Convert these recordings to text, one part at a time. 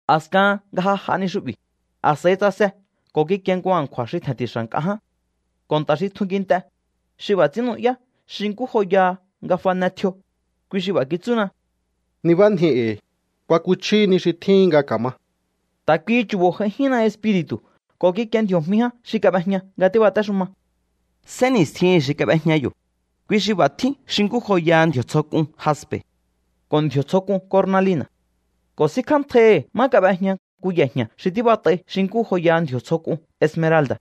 A̱skahan nga ja j'a ni xu'bi̱, a̱s'a̱i tsase ko̱ kikie nku a̱nkju̱a̱ xi tje̱nti̱xa̱ nk'a ján. Ko̱ nta̱ xi tjun kint'e, xi b'a̱ ts'ín nu'yá xi nkú joyaha nga fane tjio, kui xi b'a̱ kitsúna: —Nibánji e̱i̱. Kuakuchjíhi ni xi tjíhin nga ka̱ma. Ta̱ kuihi chu̱bo̱ j'aijínna Espiri̱tu̱ ko̱ kikie ndji̱o̱jmi ján xi kab'ejña nga tíbatéxuma. Sénni̱stjihi̱n xi kab'ejña yo̱, kui xi b'a̱ tjín xi nkú joyaha ndji̱o̱ tsjo k'un jaspe̱ ko̱ ndji̱o̱ tsjo k'un kornalina̱. Ko̱ sínkjántjaihi̱ má kab'ejña nku ye̱jña̱ xi tíbat'ai xi nkú joyaha ndji̱o̱ tsjo k'un esmeralda̱.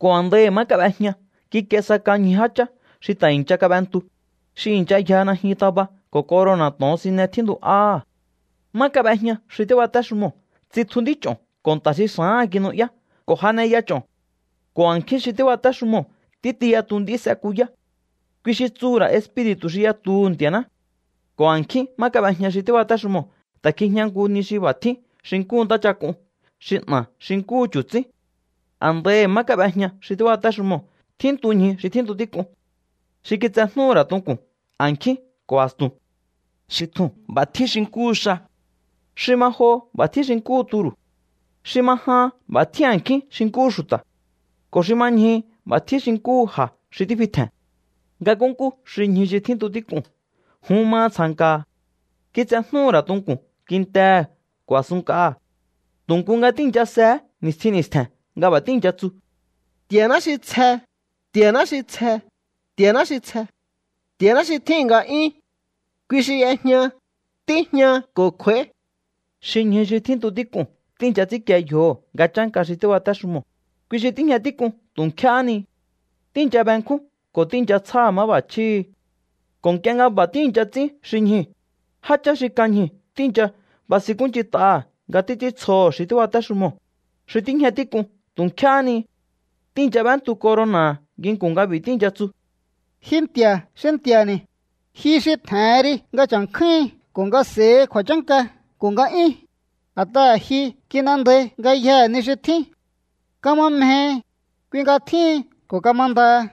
Ko̱ a̱ndaihi̱ má kab'ejña kikie sa kan ñju jáchá xi ta̱ i̱ncha kab'entu, xi i̱ncha yja najyun taba ko̱ corona̱ to̱onsine tjíntu'áha̱. Má kab'ejña xi tíbatéxumoo̱ tsitju nd'ích'o̱n ko̱ nta̱ xi xa̱áha̱n kinu'yá ko̱ janeya ch'o̱n. Ko̱ a̱nkjín xi tíbatéxumoo̱ títi yatu nd'í s'ekuyá. Kui xi tsuhu̱ ra̱ espiri̱tu̱ xi yatuhu̱ Nti̱a̱ná. Ko̱ a̱nkjín má kab'ejña xi tíbatéxumoo̱ ta̱ kjijña nku ni xi b'a̱ tjín xi nkúhu ntáchak'un xi 'na̱ xi nkúhu chu̱tsín. A̱ndaihi̱ má kab'ejña xi tíbatéxumoo̱ tjíntu ñju xi tjíntu tík'un, xi kitsejnúhu̱ ra̱ tunku̱n a̱nkjín ko̱ a̱stu̱n. Xi tjuu̱n b'a̱ tjín xi nkúhu xa. Xi ma joho b'a̱ tjín xi nkúhu turu̱. Xi ma jahan b'a̱ tjín a̱nkjín xi nkúhu xu̱ta̱. Ko̱ xi ma ñjuhu b'a̱ tjín xi nkúhu ja̱ xi tífi tje̱n. Nga nkúnkú xi ñju tjíntu tík'uu̱n jun maha tsja̱nka̱ha̱. Kitsejnúhu̱ ra̱ tunku̱n kintehe̱ ko̱ a̱sunnk'aha̱. Tu̱ nku nga tíi̱ncha sehé ni̱stjin ni̱stje̱n nga b'a̱ tíi̱ncha tsu: Nti̱a̱ná xi tsje, Nti̱a̱ná xi tsje, Nti̱a̱ná xi tsje. Nti̱a̱ná xi tjíhi̱n nga'yún. Kui xi y'ejña, tíjña ko̱ kj'u̱a̱í. Xi ñju tjíntu tík'uu̱n tíi̱ncha ts'ínkie yjoho̱ nga chánka xi tíbatéxumoo̱, kui xi tíjña tík'un tu̱ nkjéhé ni. Tíi̱ncha benkjún ko̱ tíi̱ncha tsjáha̱ máb'a̱chjíhi̱. Ko̱ nk'ie nga b'a̱ tíi̱ncha ts'ín xi ñjuu̱, jáchá xi kan ñjuu̱ tíi̱ncha basinkúnch'int'aha̱ nga títs'íntsjoho̱ xi tíbatéxumoo̱, xi tíjña tík'un tu̱ nkjéhé ni. Tíi̱ncha b'éntu corona̱ha̱ nginku̱n nga b'i̱ tíi̱ncha tsu: Ji Nti̱a̱ xi Nti̱a̱ni̱, ji xi tje̱hen ri nga cha̱nkjúhin ko̱ nga s'e̱hi kju̱a̱chánka ko̱ nga'yún. A̱t'aha̱ ji kin'endai ngayjee̱ ni xi tjín. Kama mjehi, kui nga tjíhin ko̱ kamandaha.